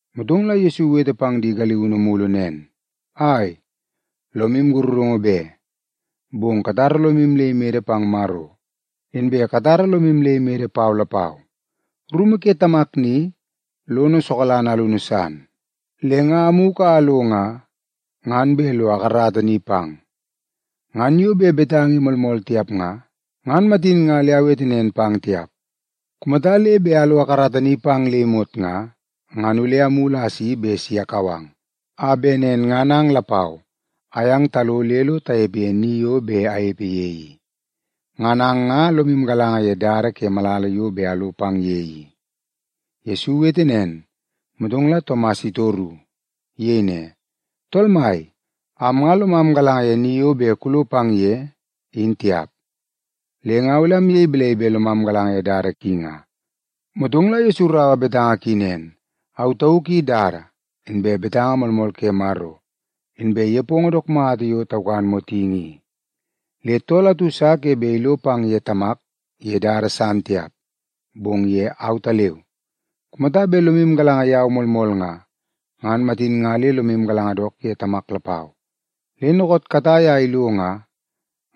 Motong la Yesu iwete pang di galiunu mulu nen, “Ai, lomu sakarungu be. Bong katara lomu le imede pang Maro, inbe katara lomu le imede pau lapau. Rumu ke Tamak ni, lono sokalanga alunu san. Le nga amugu a alo nga, ngan bet lo akarata ni pang. Ngan yo bet betanga i moolmool tiap nga, ngan matin nga le awete nen pang tiap. Kumata le bet alo akarata ni pang le imot nga, ngan ole amulu a asi bet si akau ang, a bet nen ngan ang lapau ayang talo le lo tanepe ye ni yo bet anepe ye i Ngan ang nga lomu galanga ye dada ke malala yo bet alo pang ye i.” Yesu iwete nen, motong la Tomas itoru. Iyei ne, “Tool Mai, am nga lomam galanga ye ni yo bet kulo pang ye, in tiap. Le nga ole amyei balai bet lomam galanga ye dada ki nga?” Motong la Yesu iraua betanga ki nen, “Au tauk i dada, inbe betanga moolmool ke Maro, inbe nepongo dook mata yo taukan motingi i. Le tool atu sa ke bet ilo pang ye Tamak ye dada san tiap, bong ye autaleu. Kumata bet lomu galanga yau moolmool nga, ngan matin nga le lomu galanga dook ye Tamak lapau. Le dookoot katai a ilo nga,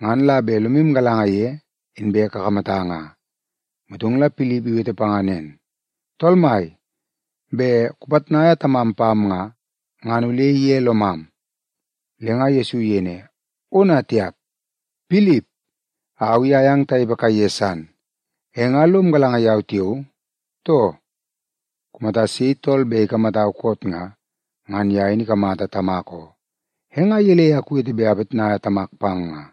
ngan la bet lomu galanga ye, inbe kakamata nga.” Motong la Pilip iwete panga nen, “Tool Mai, bet kupitnaia Tamam pam nga, ngan ole ige lomam.” Le nga Yesu iyei ne, “Ona tiap! Pilip, au i ayang tanepe kaiye san, e nga lom galanga yau tiao, too? Kumata sei tool bet ikamatau koot nga, ngan ye in ikamata Tamak oo. E nga gelei a kuwete bet apitnaia Tamak pang nga?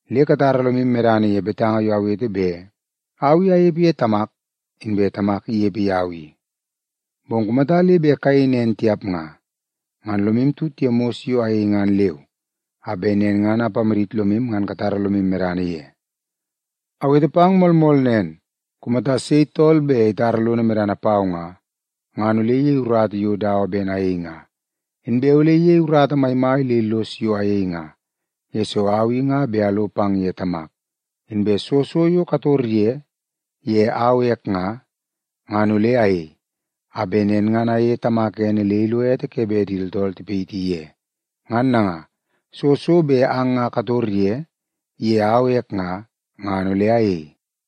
Le katara lomu medana ye betanga yo awete bet au i anepe ye Tamak, inbe Tamak inepe yau i. Bong kumata le bet kayei nen tiap nga, ngan lomu tut ye mos yo ayei ngan leu, a bet nen ngan ipamadit lomu ngan katara lomu medana ye. Awete pang moolmool nen, kumata sei tool bet itara lono medana pau nga, ngan ole iyei urata yo dawa ben ayei nga. Inbe ole iyei urata maimai le illos yo ayei nga, yesoo au i nga bet alo pang ye Tamak. Inbe soo so yo kator ye, ye au ek nga, ngan ole ayei, a bet nen ngan ayeie Tamak ene le ilo ete ke bet di tooltool tipayiti ye. Ngan nanga, soo so bet ang nga kator ye, ye au ek nga, ngan ole ayei.”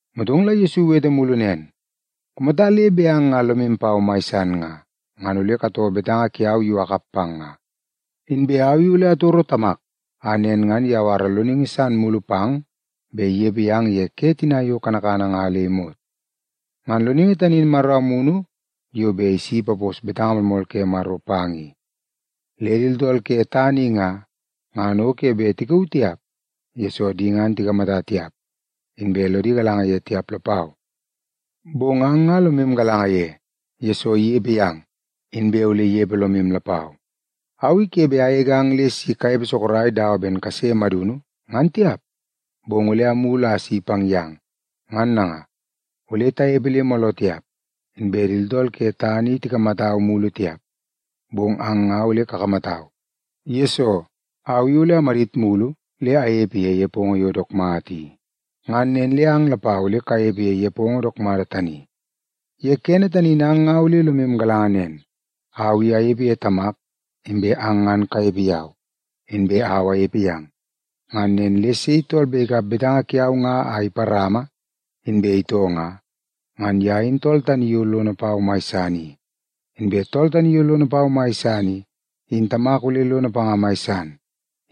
Motong la Yesu iwete mulu nen, “Kumata le bet ang nga lomu pau mai san nga, ngan ole katoo betanga kiau yo akap pang nga. Inbe au i ole atoro Tamak, a nen ngan iyawara Loningi san mulu pang bet inepe yang ye ke tina yo kanakana nga le imot. Ngan Loningi tani in Maro Amunu yo bet si ipapos betanga moolmool ke Maro pang i. Le di tooltool ke tana i nga, ngan o ke bet tikauu tiap, yesoo di ngan tikamata tiap, inbe lodi galanga ye tiap lapau. Bong ang nga lomu galanga ye, yesoo inepe yang, inbe ole inepe lomu lapau. Au i ke bet agegang le si kanepe sorok dawa ben kase madunu, ngan tiap, bong ole amulu a asi pang yang. Ngan nanga, ole tanepe le mooloo tiap, inbe di tooltool ke tana i tikamatau mulu tiap, bong ang nga ole kakamatau, yesoo, au i ole amadit mulu le anepe ye nepongo yo dook mata i. Ngan nen le ang lapau ole kanepe ye nepongo dook mata tani. Ye kene tani in ang nga ole lomu galanga nen, au i anepe ye Tamak, inbe ang ngan kanepe yau, inbe au anepe yang. Ngan nen le sei tool bet ikap betanga kiau nga a iparama, inbe itoo nga, ngan ye in tool tani yo lono pau mai san i. Inbe tool tani yo lono pau mai san i, in Tamak ole lono panga mai san.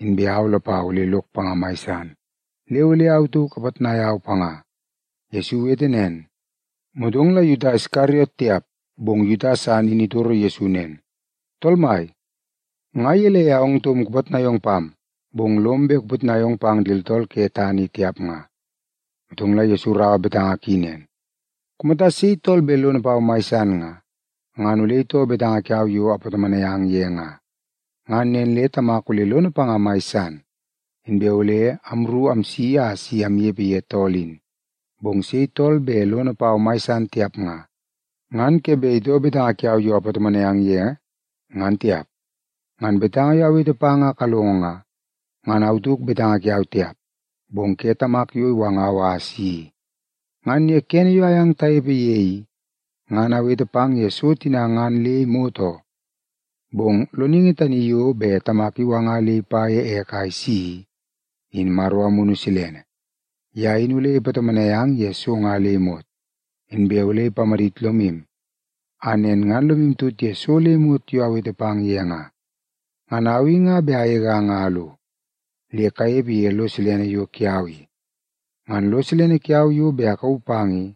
Inbe au lapau ole lok panga mai san, le ole au tauk apitnai au panga.” Yesu iwete nen, motong la Yuta Iskariot tiap, bong Yuta san in itoro Yesu nen, “Tool Mai, nga gelei a ong taum kupitnai ong pam, bong lom bet kupitnai ong pang di tooltool ke tana i tiap nga?” Motong la Yesu iraua betanga ki nen, “Kumata sei tool bet lono pau mai san nga, ngan ole itoo betanga kiau yo apatomonai ang ye nga. Ngan nen le Tamak ole lono panga mai san, inbe ole amru amsi a si amnepe ye tool in. Bong sei tool bet lono pau mai san tiap nga, ngan ke bet itoo betanga kiau yo apatomonai ang ye, ngan tiap. Ngan betanga yo awete pang a kalongo nga, ngan au tauk betanga kiau tiap, bong ke Tamak yo iwangau a asi i. “Ngan ye kene yo ayang tanepe ye i, ngan awete pang ye so tina ngan le imot oo. Bong Loningi tani yo bet Tamak iwanga le ipa ye ek a isi i, in Maro Amunu Silene. Ye in ole ipatomonai ang ye so nga le imot, inbe ole ipamadit lomu a nen ngan lomu tut ye so le imot yo awete pang ye nga. Ngan au i nga bet agegang a alo, le kanepe ye lo silene yo kiau i. Ngan lo silene kiau yo bet akauu pang i,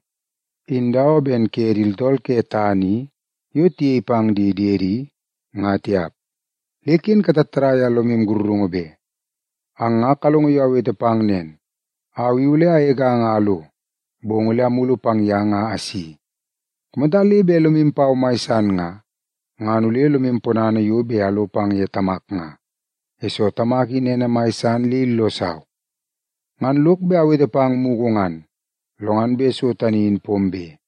in dawa ben ke di tooltool ke tana i yo tiyei pang di diedi, nga tiap. Le ken katattadai a lomu sakarungu be. “Ang nga kalongo yo awete pang nen, ‘Au i ole agegang a alo, bong ole amulu pang yang a asi.’ Kumata le bet lomu pau mai san nga, ngan ole lomu ponana yo bet alo pang ye Tamak nga, yesoo Tamak in ene mai san le illosau. Ngan lok bet awete pang mugu ngan, lo ngan bet so tani in pombe,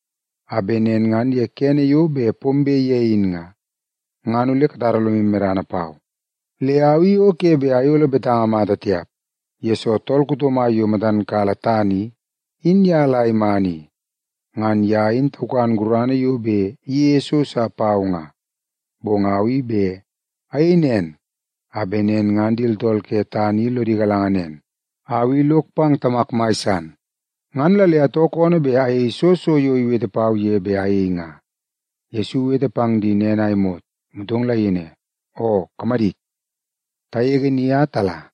a bet nen ngan ye kene yo bet pombe ye in nga, ngan ole katara lomu medana pau. Le au i o ke bet ayolo betanga mata tiap, yesoo tool kuto mai yo matan kala tana i, in ye la iman i. Ngan ye in taukan gurana yo bet iyeie so sa pau nga. Bong au i bet ayei nen a bet nen ngan di tooltool ke tana i lodi galanga nen, au i lok pang Tamak mai san, ngan la le atoo koonoo bet ayei soo so yo iwete pau ye bet ayei nga.” Yesu iwete pang di nen a imot, motong la iyei ne, “Oo, kamadit. Tagege ni a tala.”